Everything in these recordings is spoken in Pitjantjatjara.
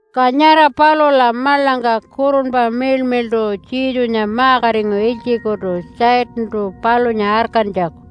Ka nyara palula maḻangka Kurunpa Miḻmiḻṯu Jesunya ma-katingu ilytjikutu Satantu palunya arkantjaku.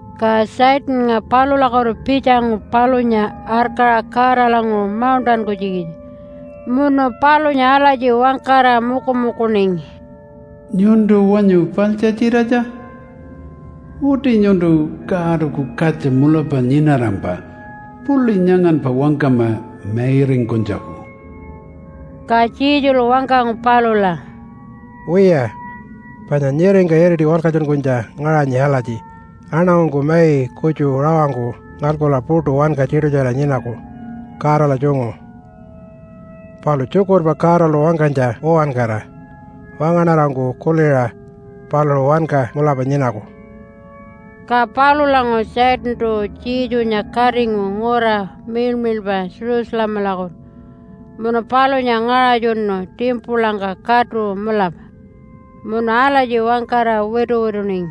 Ka Satannga palulakutu pitjangu palunya arkaṟa Godalanguṟu mauṉṯankunytjikitja munu palunya alatji wangkara mukumukuningi, “Nyuntu wanyu paḻtjatjiratja? Uti nyuntu Godaku Katja mulapa nyinarampa puḻi nyanganpa wangkama mairingkunytjaku.” Ka Jesulu wangkangu palula, “Wiya, panya nyiringka iriti walkatjunkunytja ngaṟanyi alatji, ‘Aṉangungku mai kutju rawangku ngalkula puṯu wanka tiṯutjara nyinaku Godala tjungu, palu tjukurpa Godalu wangkanytja uwankara wangaṉarangku kuliṟa paluṟu wanka mulapa nyinaku.’” Ka palulanguṟu Satantu Jesunya katingu ngura miḻmiḻpa Jerusalemalakutu munu palunya ngaṟatjunu timpulangka katu mulapa. Munu alatji wangkara wituwituningi,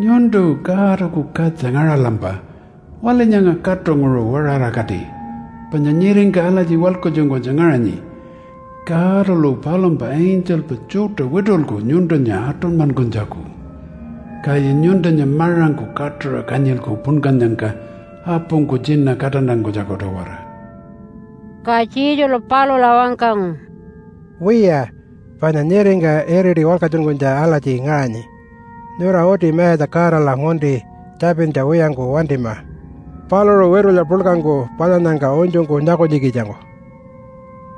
“Nyuntu Godaku Katja ngaṟalampa waḻi nyanga katunguṟu waṟarakati panya nyiringka alatji walkatjunkunytja ngaṟanyi, ‘Godalu palumpa angelpa tjuṯa witulku nyuntunya aṯunymankunytjaku, kaya nyuntunya maṟangku katuṟa kanyilku punkannyangka apungku tjina kaṯantankunytjaku-tawara.’” Ka Jesulu palula wangkangu, “Wiya, panya nyiringka iriti walkatjunkunytja alatji ngaṟanyi, ‘Nyura uti Mayatja Godala ngunti tjapintja wiyangku wantima paluṟu witulya puḻkangku palyannyangka unytjungku nyakunytjikitjangku.’”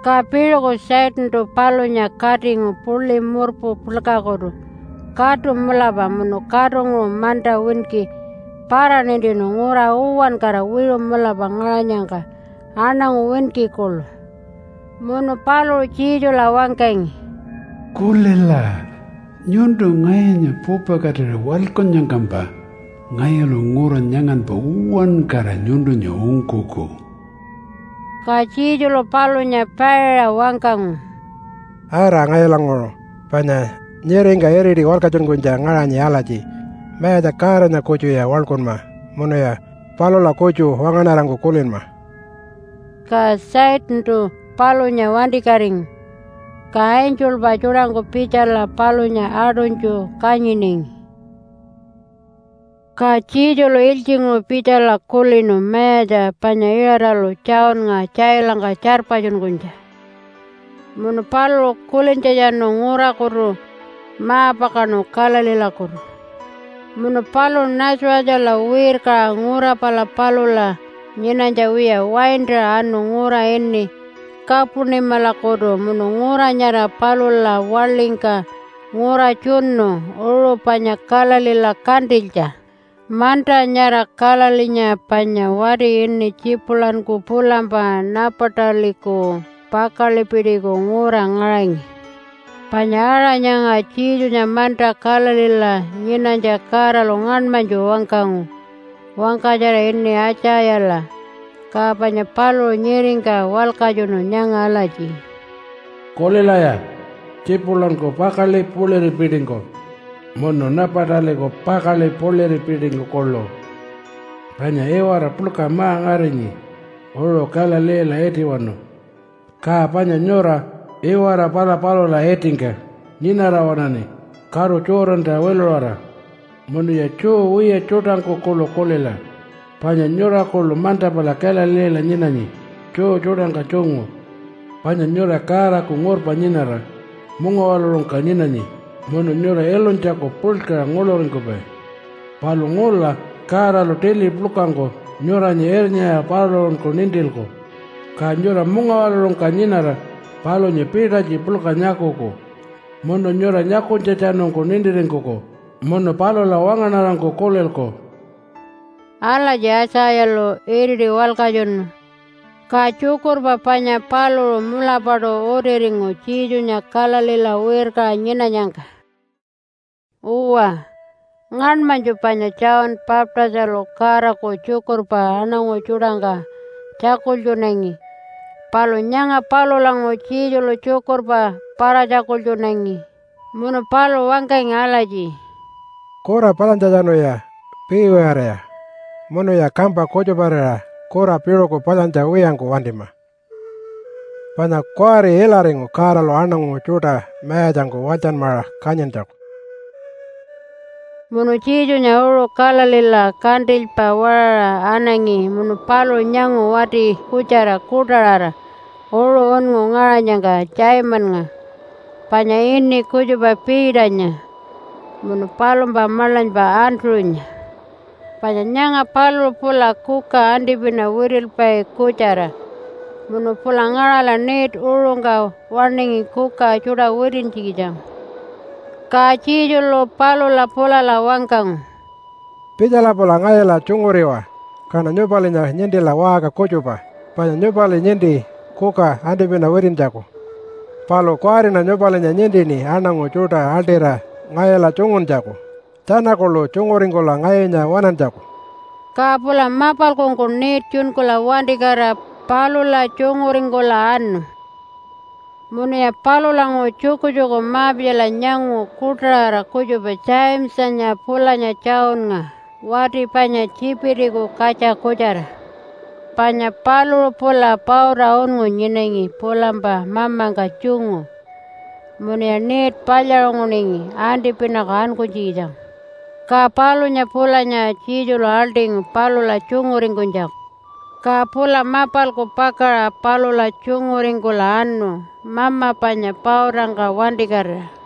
Ka piṟuku Satantu palunya katingu puḻi murpu puḻkakutu katu mulapa munu katunguṟu manta winki para-nintinu ngura uwankara wiṟu mulapa ngaṟanyangka aṉangu winki kuḻu. Munu paluṟu Jesula wangkangi, “Kulila! Nyuntu ngayunya pupakatira waḻkunnyangkampa ngayulu ngura nyanganpa uwankara nyuntunya ungkuku.” Ka Jesulu palunya paiṟa wangkangu, “Ara ngayulanguṟu! Panya nyiringka iriti walkatjunkunytja ngaṟanyi alatji, ‘Mayatja Godanya kutjuya waḻkunma munuya palula kutju wangaṉarangku kulinma.’” Ka Satantu palunya wantikatingu, ka angelpa tjuṯangku pitjala palunya aṯunytju kanyiningi. Ka Jesulu ilytjinguṟu pitjala kulinu mayatja panya Iṟatalu Johnnga tjailangka tjarpatjunkunytja, munu paluṟu kulintjatjanu ngurakutu ma-pakaṉu Galileelakutu. Munu paluṟu Nazarethala wirkaṟa ngura pala palula nyinanytja wiya waintaṟa anu ngura ini Kapunimalakutu munu ngura nyara palula waḻingka ngura tjunu uṟu panya Galileela kantilytja. Manta nyara Galileenya panya wati ini Tjipulanku pulampa Napataliku pakaḻipitiku ngura ngaṟangi. Panya aṟa nyanga Jesunya manta Galileela nyinanytja Godalu ngaṉmanytju wangkangu wangkatjara ini Aitjayala, ka panya paluṟu nyiringka walkatjunu nyanga alatji, “Kulilaya Tjipulanku pakaḻi puḻiripitingku munu Napataliku pakaḻi puḻiripitingku kuḻu! Panya iwara puḻka ma-ngarinyi uṟu Galileela itiwanu, ka panya nyura iwara pala palula itingka nyinara waṉaṉi karu Jordanta wiluṟara. Munuya Jew wiya tjuṯangku kuḻu kulila, panya nyura kuḻu manta pala Galileela nyinanyi Jew tjuṯangka tjungu. Panya nyura Godaku ngurpa nyinara mungawaḻuṟungka nyinanyi, munu nyura ilunytjaku puḻkaṟa nguḻuringkupai. Palu ngula Godalu tili puḻkangku nyuranya irnyaṟa paluṟunku nintilku, ka nyura mungawaḻuṟungka nyinara palunya pitalytji puḻka nyakuku, munu nyura nyakunytjatjanungku nintiringkuku munu palula wangaṉarangku kulilku.” Alatji Aitjayalu iriti walkatjunu, ka tjukurpa panya paluṟu mulapaṯu utiringu Jesunya Galileela wirkaṟa nyinanyangka. Uwa, ngaṉmanytju panya John Baptistalu Godaku tjukurpa aṉangu tjuṯangka tjakultjunangi, palu nyanga palulanguṟu Jesulu tjukurpa para-tjakultjunangi. Munu paluṟu wangkangi alatji, “Kura palyantjatjanuya piiwiyariwaya munuya kampa kutjuparira kura piṟuku palyantja wiyangku wantima, panya kuwari ilaringu Godalu aṉangu tjuṯa mayatjangku walytjanmaṟa kanyintjaku.” Munu Jesunya uṟu Galileela kantilypa waṟaṟa anangi munu paluṟu nyangu wati kutjara kuṯaṟara uṟu unngu ngaṟanyangka Simonnga, panya ini kutjupa Peternya, munu palumpa maḻanypa Andrew-nya. Panya nyanga paluṟu pula kuka antipina witilpai kutjara munu pula ngaṟala net uṟungka waṉingi kuka tjuṯa witintjikitjangku. Ka Jesulu palula pulala wangkangu, “Pitjala pula ngayula tjunguriwa, kaṉa nyupalinya nintila waṟka kutjupa. Panya nyupali ninti kuka antipina witintjaku, palu kuwariṉa nyupalinya nintini aṉangu tjuṯa aḻṯira ngayula tjunguntjaku tjana kuḻu tjunguringkula ngayunya waṉantjaku.” Ka pula mapalkungku net tjunkula wantikatira palula tjunguringkula anu. Munuya palulanguṟu tjukutjuku ma-pitjala nyangu kuṯaṟara kutjupa Jamesanya pulanya Johnnga wati panya Tjipitiku katja kutjara. Panya paluṟu pula pauta unngu nyinangi pulampa mamangka tjungu, munuya net palyaṟunguningi antipinaku ankunytjikitjangku. Ka palunya pulanya Jesulu aḻṯingu palula tjunguringkunytjaku. Ka pula mapalku pakaṟa palula tjunguringkula anu mama panya pautangka wantikatira.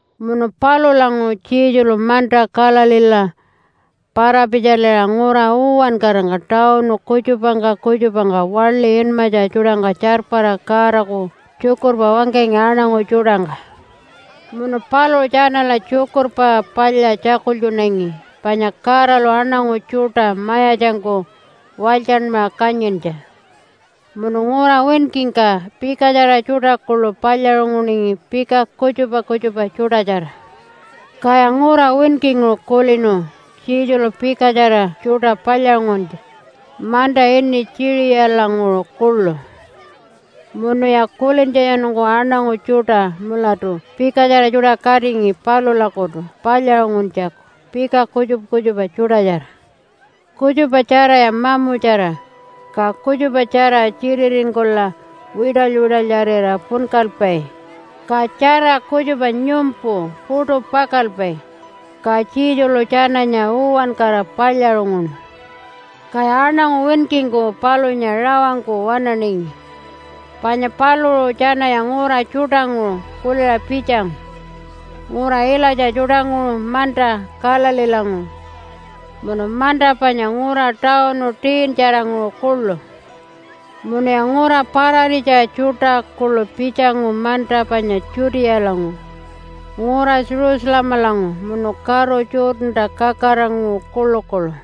Munu palulanguṟu Jesulu manta Galileela para-pitjaliṟa ngura uwankarangka tawunu kutjupangka kutjupangka waḻi inmatja tjuṯangka tjarpara Godaku tjukurpa wangkangi aṉangu tjuṯangka. Munu paluṟu tjanala Tjukurpa Palya tjakultjunangi panya Godalu aṉangu tjuṯa mayatjangku walytjanmaṟa kanyintja. Munu ngura winkingka pikatjara tjuṯa kuḻu palyaṟunguningi pika kutjupa kutjupa tjuṯatjara. Kaya ngura winkinguṟu kulinu Jesulu pikatjara tjuṯa palyaṟunguntja manta ini Tjiṟiyalanguṟu kuḻu. Munuya kulintjatjanungku aṉangu tjuṯa mulatu pikatjara tjuṯa katingi palulakutu palyaṟunguntjaku pika kutjupa kutjupa tjuṯatjara. Kutjupa tjaraya mamutjara, ka kutjupatjara tjititingkula wiṯaly-wiṯalyarira punkalpai, ka tjara kutjupa nyumpu puṯu pakalpai. Ka Jesulu tjananya uwankara palyaṟunguṉu. Kaya aṉangu winkingku palunya rawangku waṉaningi, panya paluṟu tjanaya ngura tjuṯanguṟu kuliṟa pitjangu, ngura ilatja tjuṯanguṟu manta Galileelanguṟu, munu manta panya ngura tawunu 10-tjaranguṟu kuḻu. Munuya ngura pararitja tjuṯa kuḻu pitjangu manta panya Judealanguṟu, ngura Jerusalemalanguṟu, munu karu Jordanta kakaraṟanguṟu kuḻukuḻu.